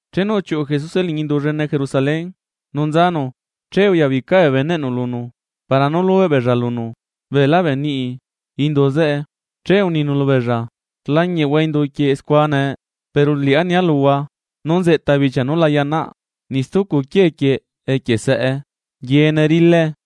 Chenu uchiuꞌu Jesuse liñi indu llene Jerusalén nu nzanu, che uyabica bee beneꞌnu lunu, para nú lubeꞌ beella lunu beelá bee niꞌi nú necacheꞌ indu zeꞌe. Che uninu lubeella: ―Rlañiꞌhua indu quieꞌ scua nee. Pero liꞌá nia luhua nú nzeꞌta bichia nú la yaꞌnaꞌ niꞌ stucu quiee quieꞌ equie saꞌe. Yeene rilae.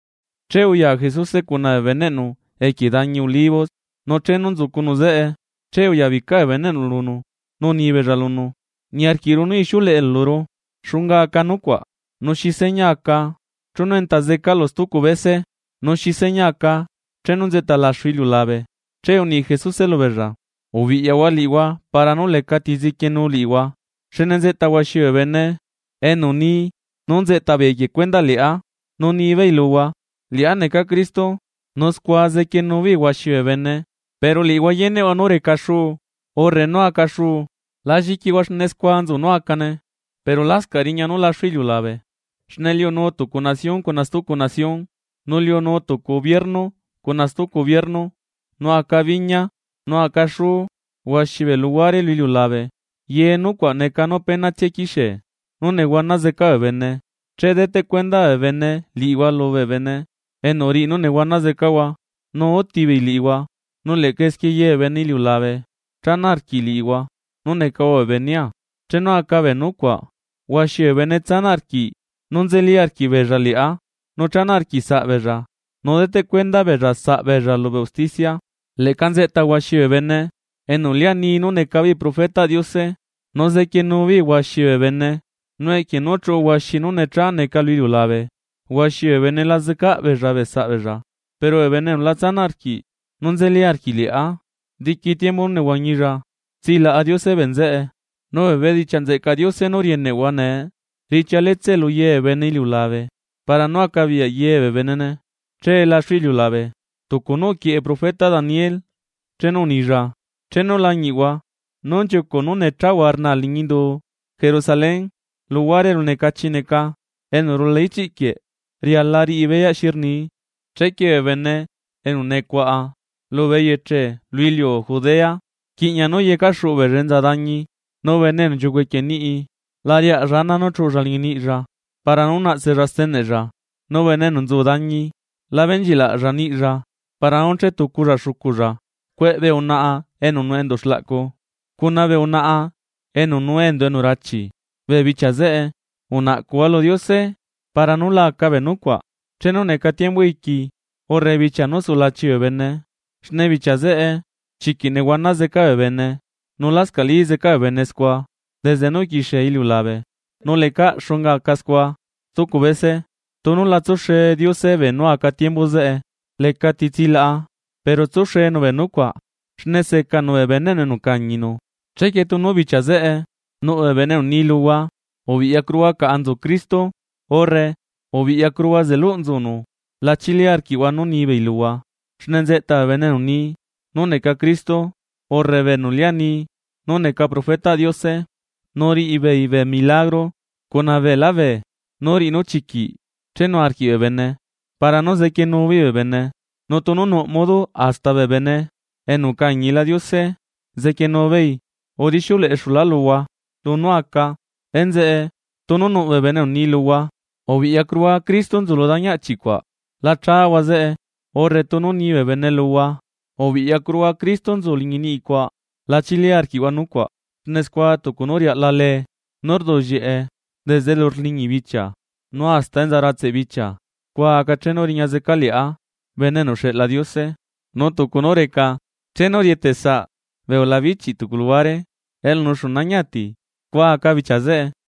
Che uya Jesuse cuna bee beneꞌnu equie dañi Olivos, nu chenu nzucunu zeꞌe, che uyabica bee beneꞌnu lunu nu unibeella lunu: ―Niarquiꞌru nú ixiuleꞌelu luru. ¿Xunga aca nucuaꞌ? Nu ¿xi seña aca chenu enta zecalu stucu bese?, nu ¿xi seña aca chenu nzeꞌta laxu iliulabe? Che uni Jesuse lubeella: ―Ubiꞌyahua liꞌihua para nú lecati zequienu liꞌihua. Xne nzeꞌta huaxi bee bene enu ni nú nzeꞌta beei equie cuendaꞌ liꞌá, nu nibeei luhua: “Liꞌá necaa Cristo”, nu scua zequienu beei huaxi bee bene. Pero liꞌihua yeneꞌhua nú reca xuu urre nú aca xuu, la lliquihua xne scua nzu nú acane, pero lascaꞌ riña nú laxu iliulabe. Xne liunu tucu nación cuna stucu nación, nu liunu tucu ubiernu cuna stucu ubiernu, nu aca biña, nu aca xú huaxi bee luhuare lu iliulabe. Ye nucuaꞌ neca nú apenatsia quixie nú nehuana zeca bee bene. ’Che deteꞌ cuenda bee bene liꞌihua lubee bene enu riꞌi nú nehuana zecahua, nu utibeei liꞌihua, nu leꞌca esquie ye bee bene iliulabe chana arquiꞌ liꞌihua nú necahua bee benea. Chenu aca bee nucuaꞌ huaxi bee bene tsanaꞌ arquiꞌ nú nzeli arquiꞌbeella liꞌá, nu chana arquiꞌsaꞌ beella, nu deteꞌ cuenda beella saꞌ beella lubee usticia. Leꞌca nzeꞌta huaxi bee bene enu lia ni nú neca beei profetaꞌ Diose. Nu zequienu beei huaxi bee bene. Nu equie nú chuꞌu huaxi nú necha neca lu iliulabe, huaxi bee bene la zecaꞌ beella saꞌbeella. Pero bene enu la tsanaꞌ arquiꞌ nú nzeli arquiꞌ liꞌá diqui tiembu nú nehuañilla, tsilaꞌa Diose bee nzeꞌe. Nu bee bedichiaꞌ nzeꞌcaꞌ Diose nú rieneꞌhua nee riꞌchia letsee luye bee bene iliulabe, para nú acabiyaꞌ yebee benene che laxu iliulabe. ’Tucu nú uquieꞌe profeta Daniel chenu unilla: Chenu lañiꞌhua nú nchiucuꞌ nú nechahua rnaa liñi indu Jerusalén luhuare elu necachi neca, enu rula ichiꞌ quieꞌ riala riꞌi beyaꞌ xi rnii, chequie bee bene enu nucuaꞌa lubee eyeche lu iliu Judea, rquiꞌña nú yecaxuꞌu beella enza dañi. Nu bene enu nchiucuꞌ equie niꞌi, la riaꞌlla ana nú chuꞌulla liñi niꞌlla para nú naꞌtsella steneꞌlla; nu bene enu nzu dañi, la benchilaꞌlla niꞌlla para nú chetuculla xuculla. ¡Cueꞌ bee unaꞌa enu nuꞌ enduꞌ xlaꞌcu cuna bee unaꞌa enu nuu enduꞌ enu rachi bee bichia zeꞌe! Unaꞌcuhua lu Diose para nú la aca bee nucuaꞌ chenu neca tiembu iqui, urre bichia nú sulachi bee bene; xne bichia zeꞌe chiquiꞌ nehuana zeca bee bene, nu lascaꞌlí zeca bee bene scua desde nú uquixie iliulabe, nu lecaꞌ xunga aca scua stucu bese. Tunu la tsuxe Diose beenú aca tiembu zeꞌe, lecati tsilaꞌa; pero tsuxenu bee nucuaꞌ xne secanu bee beneꞌnu enu ucañinu. ’Chequie tunu bichia zeꞌe nuꞌ bee bene enu ni luhua: “Biꞌyacuruhua caꞌa nzu Cristo”, urre “Biꞌyacuruhua, zeluꞌ nzunu”, la chili arquiꞌhua nú ni beei luhua. Xne nzeꞌta bee bene enu ni nú neca Cristo, urre bee enu lia ni nú neca profetaꞌ Diose nu riꞌibeei bee milagro cuna beelá beenú riꞌi nú chiquiꞌ chenu arquiꞌ bee bene para nú zequienuu beei bee bene, nu tunu nuꞌ modo hasta bee bene enu ucañila Diose zequienu beei. Udixiuleꞌexulá luhua lunú aca. Enzeꞌe, tunu nuꞌ bee bene enu ni luhua: “Biꞌyacuruhua Cristo nzu lu dañi achi cuaꞌ”, la chahua zeꞌe, urre tunu ni bee bene luhua: “Biꞌyacuruhua, Cristo, nzu liñi niꞌi cuaꞌ”, la chili arquiꞌhua nucuaꞌ. Xne scua tucu nú riaꞌla lee nú rduꞌllieꞌe desde elu rliñi bichia nu hasta enza ratseꞌ bichia, scua aca chenu riña zecaa liꞌá Bene enu uxeꞌla Diose. Nu tucu nú reca chenu rieteꞌ saꞌ bee ulabichi tucu luhuare, elu nuxu nañi ati scua aca bichia zeꞌe.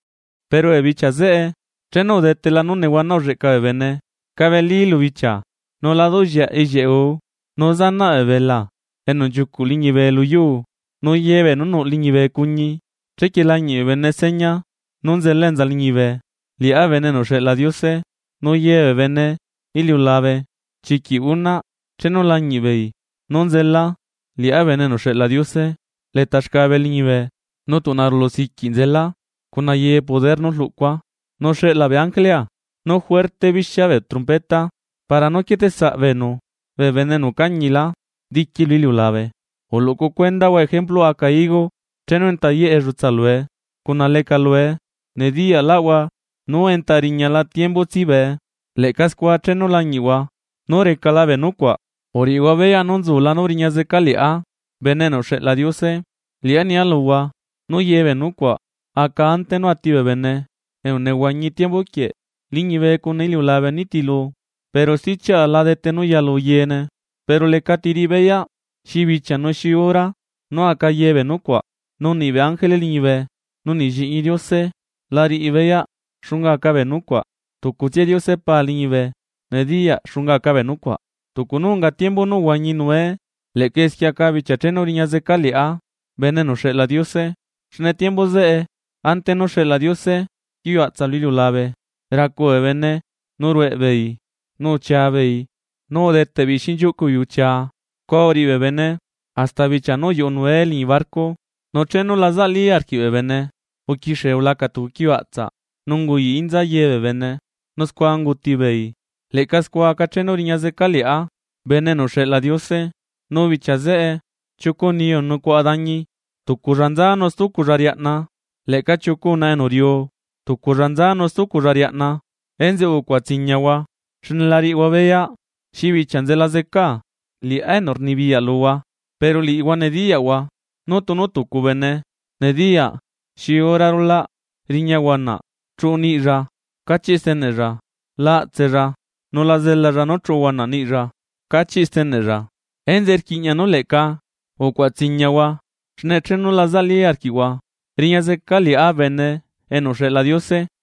’Pero bee bichia zeꞌe chenu udetela nú nehuana ulleꞌca bee bene, cabeli lu bichia, nu la duꞌllieaꞌ ellieꞌ guu, nu zanaꞌ bee belaa enu nchiucuꞌ liñibe lu yuu, nu yebee nú nuꞌ liñibe cuñi. Chequie lañiꞌ bee bene seña nú nzela enza liñibe, liꞌá Bene enu uxeꞌla Diose, nu ye bee bene iliulabe chiquiꞌ unaꞌ chenu lañiꞌ beei nú nzela liꞌá Bene enu uxeꞌla Diose leta xcabe liñibe, nu tuꞌna rulu siquiꞌ nzela cuna ye poder nú rluꞌcua. Nu xeꞌla bee ángelea nu juerte bixia bee trompeta para nú quieteꞌsaꞌ beenu bee bene enu ucañilá diqui lu iliulabe. ’Uluꞌcu cuendahua ejempluꞌ aca higo: Chenu enta yeꞌ ellutsa lue, cuna leca lue, nediyaꞌlaꞌhua nú enta riñala tiembu tsibee. Leꞌca scua chenu lañiꞌhua nú recala bee nucuaꞌ, uriꞌihua beyaꞌ nú nzula nú riña zeca liꞌá Bene enu uxeꞌla Diose. Liꞌá nia luhua nú yebee nucuaꞌ aca ante nú ati bee bene enu nehuañi tiembu quieꞌ. Liñibe cuna iliulabe nitilu, pero stichiaꞌa la dete nú yalu yeene. ’Pero lecati riꞌi beyaꞌ xi bichia nu xi hora nú aca yebee nucuaꞌ, nu niꞌ bee ángele liñibe, nu niꞌ Lliꞌñi Diose la riꞌi beyaꞌ xunga aca bee nucuaꞌ. Tucutsia Diose Pa liñibe nediyaꞌ xunga aca bee nucuaꞌ. ’Tucu nú unga tiembu nú uhuañi Noe, leꞌca esquie aca bichia chenu riña zeca liꞌá Bene enu uxeꞌla Diose. Xne tiembu zeꞌe, ante nú xeꞌla Diose quiuaꞌtsaꞌ lu iliulabe, racu bee bene nu rueꞌ beei, nu uchia beei, nu udeteꞌ beei xinchiuꞌcu beei uchia, scua uriꞌi bee bene hasta bichia nú uyuꞌu Noe liñi barco; nu chenu la zaꞌlí arquiꞌ bee bene uquixie ulaca tucu quiuaꞌtsaꞌ nu unguyaꞌ inza ye bee bene nu scua ungutibeei. Leꞌca scua aca chenu riña zeca liꞌá Bene enu uxeꞌla Diose. Nu bichia zeꞌe chiucu niyu enu nucuaꞌa dañi, tuculla nza nu stuculla riaꞌna. Leꞌca chiucu unaꞌa enu riuu, tuculla nza nu stuculla riaꞌna. ’Enzeꞌe ucuaꞌa tsiñahua xne la riꞌihua beyaꞌ xi bichia nzela zecaa, liꞌá enu rnibiyaꞌ luhua. Pero liꞌihua nediyaꞌhua nú tunu tucu bene nediyaꞌ xi hora rulaꞌ riña huanaꞌ chuꞌu niꞌlla cachiꞌ steneꞌlla, la aꞌtsella nu la zelalla nú chuꞌu huanaꞌ niꞌilla cachiꞌ steneꞌlla. Enzeꞌe, rquiꞌña nú leꞌca ucuaꞌa tsiñahua xne chenu la zaꞌlí arquiꞌhua, riña zeca liꞌá Bene enu uxeꞌla Diose.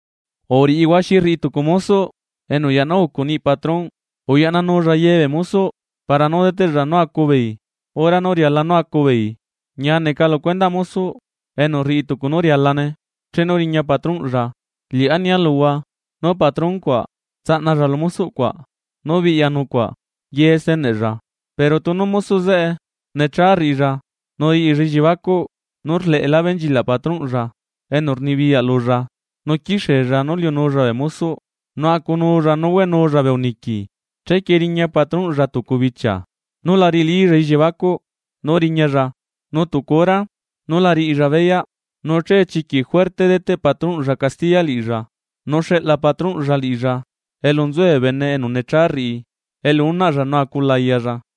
’¿Uriꞌihua xi rriꞌi tucu mosoꞌ enu uyaꞌna ucu niꞌi patronꞌ, uyaꞌnanulla ye bee mosoꞌ para nú deteꞌlla nú acu beei hora nú riala nú acu beei? Ñia neca lu cuendaꞌ mosoꞌ enu rriꞌi tucu nú rialane chenu riña patronꞌlla. Liꞌá nia luhua, nú patron cuaꞌ tsaꞌnalla lu mosoꞌ cuaꞌ nú biꞌya nucuaꞌ ye steneꞌlla. Pero tunu mosoꞌ zeꞌe necha rriꞌilla, nu riꞌilla elliebacuꞌ nú rleꞌelá benchilaꞌ patronꞌlla enu rnibiyaꞌ lulla, nu quixiella nú liunulla bee mosoꞌ, nu acunulla nu hueꞌnulla bee uniqui, chequie riña patronꞌlla tucu bichia nú la riꞌilílla elliebacuꞌ nú riñalla, nu tucu hora nú la riꞌilla beyaꞌ, nu che chiquiꞌ juerte deteꞌ patronꞌlla castiya liꞌilla, nu xeꞌla patronꞌlla liꞌilla elu nzue bee bene enu necha rriꞌi. Elu unaꞌlla nu acu layalla.